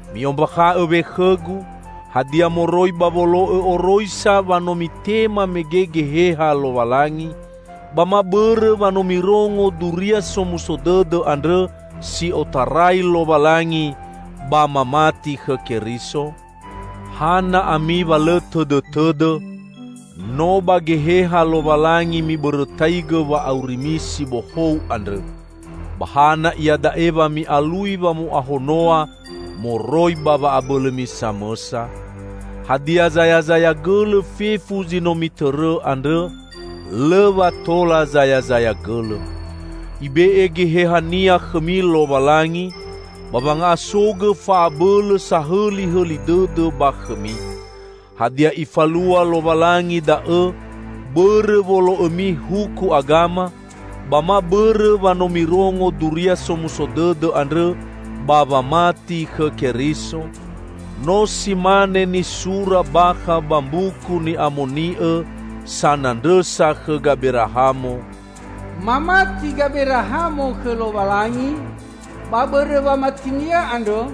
Mi'ombakha'õ we khõgu: Hadia moroi ba wolo'õ oroisa wa no mitema mege Geheha Lowalangi, ba ma bõrõ wa no mirongo Duria Somuso Dõdõ andrõ si otarai Lowalangi ba mamati khõ Keriso? Hana ami wa lõ tõdõtõdõ! No ba Geheha Lowalangi mibõrõtaigõ wa'aurimi si bohou andrõ, ba hana iada'e wa mi'alui wamo'ahonoa moroi ba wa'abõlõmi samõsa? Hadia zayazaya gõlõ fefu zi no mitõrõ andrõ? Lõ wa tola zayazaya gõlõ! Ibe'e Geheha-Nia khõmi Lowalangi, ba wanga'asogõ fa'abõlõ sahõlihõli dõdõ ba khõmi. Hadia, Ifalua Lowalangi da'õ, bõrõ wolo'õmi huku agama, ba ma bõrõ wa no mirongo Duria Somuso Dõdõ andrõ ba wamati khõ Keriso? No si mane nisura bakha ba Mbuku Ni'amoni'õ sanandrõsa khõ Gaberahamo, "Mamati Gaberahamo khõ Lowalangi, ba bõrõ wamatinia andrõ,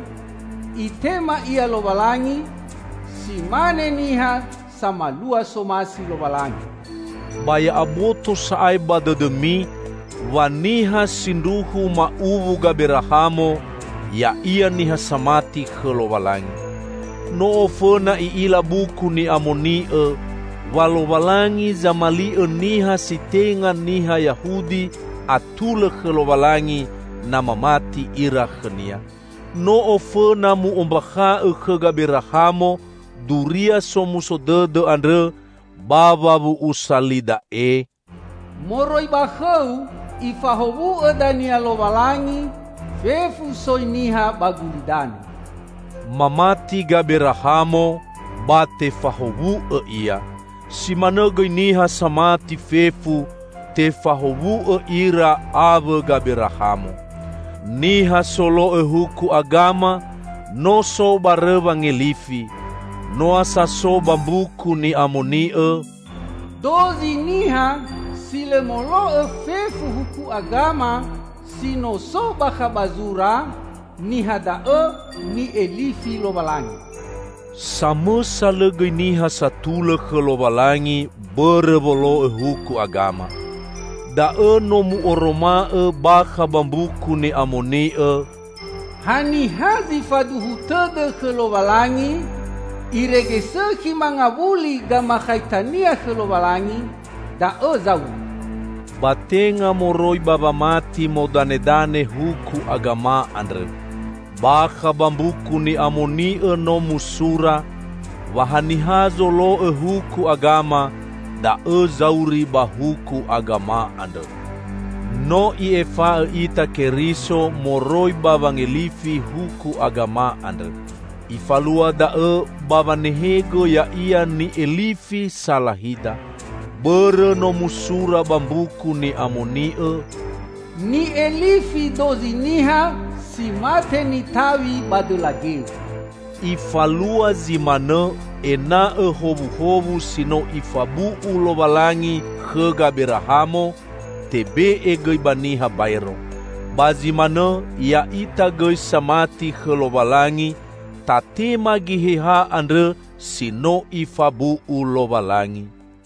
Itema ia Lowalangi si mane niha samalua somasi Lowalangi." Ba ya'aboto sa'ae ba dõdõmi, wa niha sindruhu ma'uwu Gaberahamo, ya'ia niha samati khõ Lowalangi. No ofõna i'ila Buku Ni'amoni'õ, wa Lowalangi zamali'õ niha si tenga niha Yahudi atulõ khõ Lowalangi na mamati ira khõ-Nia. No ofõna mu'ombakha'õ khõ Gaberahamo Duria Somuso Dõdõ andrõ ba wawu'usa li da'e, "Moroi ba khõu, Ifahowu'õ dania Lowalangi fefu soi niha ba gulidanõ." Mamati Gaberahamo, ba tefahowu'õ ia. Si manõ gõi niha samati fefu, tefahowu'õ ira awõ Gaberahamo. Niha solo'õ huku agama, no so barõ wangelifi. Noa sa so ba Mbuku Ni'amoni'õ, "Dozi niha si lõ molo'õ fefu Huku Agama si no so bakha ba zura, niha da'õ ni'elifi Lowalangi!" Samõsa lõ gõi niha satulõ khõ Lowalangi, bõrõ wolo'õ huku agama. Da'õ no mu'oroma'õ bakha ba Mbuku Ni'amoni'õ, "Ha niha si faduhu tõdõ khõ Lowalangi, irege sõkhi mangawuli gamakhaitania khõ Lowalangi, da'õ zauri!" Ba tenga moroi ba wamati modanedane huku agama andrõ. Bakha ba Mbuku Ni'amoni'õ no musura, wa haniha zolo'õ huku agama, da'õ zauri ba huku agama andrõ. No I'efa'õ ita Keriso moroi ba wangelifi huku agama andrõ. Ifalua da'õ ba wanehegõ Ya'ia ni'elifi salahida. Bõrõ no musura ba Mbuku Ni'amoni'õ, "Ni'elifi dozi niha si mate nitaw̃i ba dõla geu." Ifalua zi manõ, ena'õ howuhowu si no Ifabu'u Lowalangi khõ Gaberahamo, tebe'e gõi ba niha baero. Ba zi manõ, ya'ita gõi samati khõ Lowalangi, tatema Geheha andrõ si no Ifabu'u Lowalangi.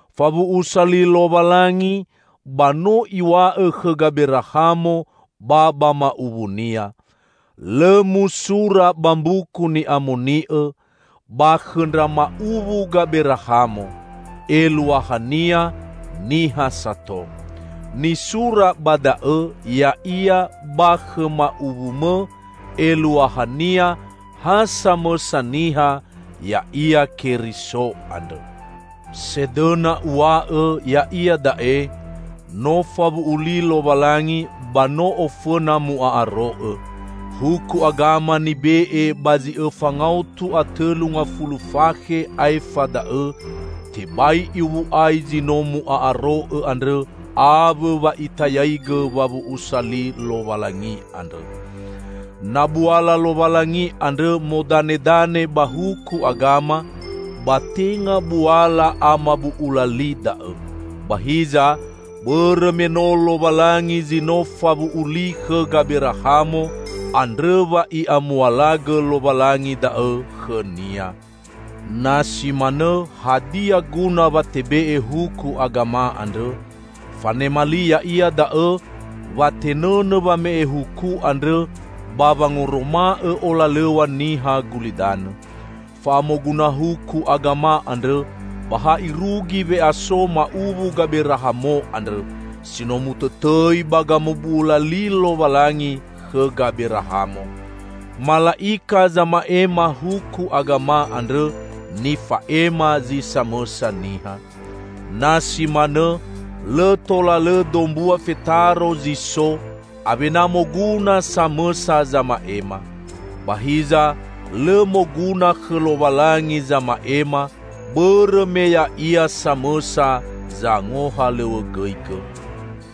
Fawu'usa li Lowalangi, ba no Iw̃a'õ khõ Gaberahamo ba ba ma'uwunia. Lõ musura ba Mbuku Ni'amoni'õ "ba khõ ndra ma'uwu Gaberahamo", eluahania niha sato. Nisura ba da'õ ya'ia "ba khõ ma'uwumõ", eluahania ha samõsa niha, ya'ia Keriso andrõ. Sedõna uw̃a'õ, ya'ia da'e: No fawu'u li Lowalangi, ba no ofõna mu'a'aro'õ. Huku agama nibe'e ba zi õfa ngaotu a tõlu ngafulu fakhe aefa da'õ, tebai iwu'ai zi no mu'a'aro'õ andrõ awõ wa itayaigõ wawu'usa li Lowalangi andrõ. Na buala Lowalangi andrõ modanedane ba huku agama, ba tenga buala amabu'ula li da'õ. Ba hiza, bõrõ me no Lowalangi zi no fawu'u li khõ Gaberahamo, andrõ wa I'amualagõ Lowalangi da'õ khõnia. Na si manõ, hadia guna wa tebe'e huku agama andrõ? Fanema li ya'ia da'õ, wa tenõnõ wame'e huku andrõ ba wangoroma'õ olalõw̃a niha gulidanõ. Fa'amoguna huku agama andrõ ba ha irugi we'aso ma'uwu Gaberahamo andrõ, si no mutõtõi ba gamabu'ula li Lowalangi khõ Gaberahamo. Mala'ika zama'ema huku agama andrõ, nifa'ema zi samõsa niha. Na si manõ, lõ tola lõ dombua fetaro zi so, awena moguna samõsa zama'ema. Ba hiza, lõ moguna khõ Lowalangi zama'ema, bõrõ me Ya'ia samõsa zangohalõw̃õgõigõ.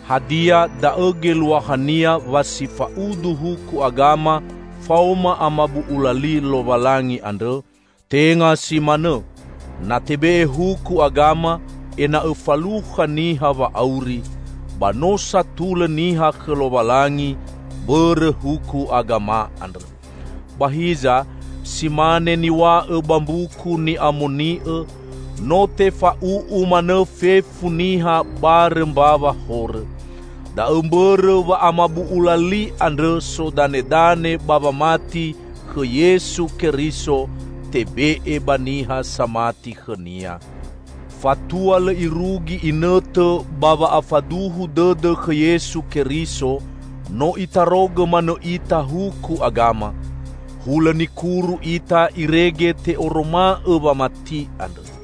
Hadia, da'õ geluahania wa si fa'udu huku agama faoma amabu'ula li Lowalangi andrõ? Tenga si manõ! Na tebe'e huku agama ena'õ falukha niha wa'auri, ba no satulõ niha khõ Lowalangi, bõrõ huku agama andrõ. Ba hiza, si mane niw̃a'õ ba Mbuku Ni'amoni'õ, no tefa'u'u manõ fefu niha barõ mbawa horõ. Da'õ mbõrõ wa amabu'ula li andrõ sodanedane ba wamati khõ Yesu Keriso, tebe'e ba niha samati khõ-Nia. Fatua lõ irugi inõtõ ba wa'afaduhu dõdõ khõ Yesu Keriso, no itarogõ manõ ita huku agama; hulõ nikuru ita irege te'oroma'õ wamati andrõ.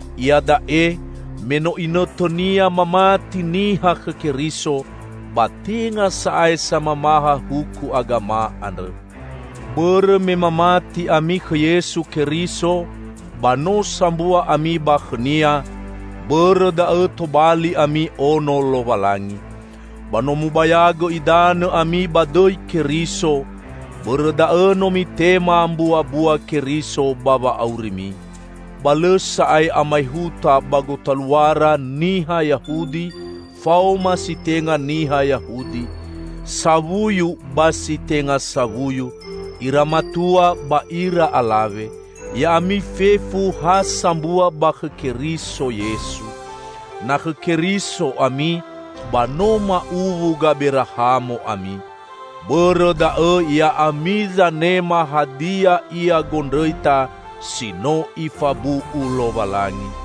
Iada'e me no inõtõnia mamati niha khõ Keriso, ba tenga sa'ae samamaha huku agama andrõ. Bõrõ me mamati ami khõ Yesu Keriso, ba no sambua ami ba khõ-Nia; bõrõ da'õ tobali ami ono Lowalangi. Ba no mubayagõ idanõ ami ba dõi Keriso, bõrõ da'õ no mitema mbuabua Keriso ba wa'aurimi. Ba lõ sa'ae amaehuta ba gotaluara niha Yahudi faoma si tenga niha Yahudi, sawuyu ba si tenga sawuyu, ira matua ba ira alawe. Ya'ami fefu ha sambua ba khõ Keriso Yesu. Na khõ Keriso ami ba no ma'uwu Gaberahamo ami. Bõrõ da'õ ya'ami zanema hadia ia gondrõita si no Ifabu'u Lowalangi.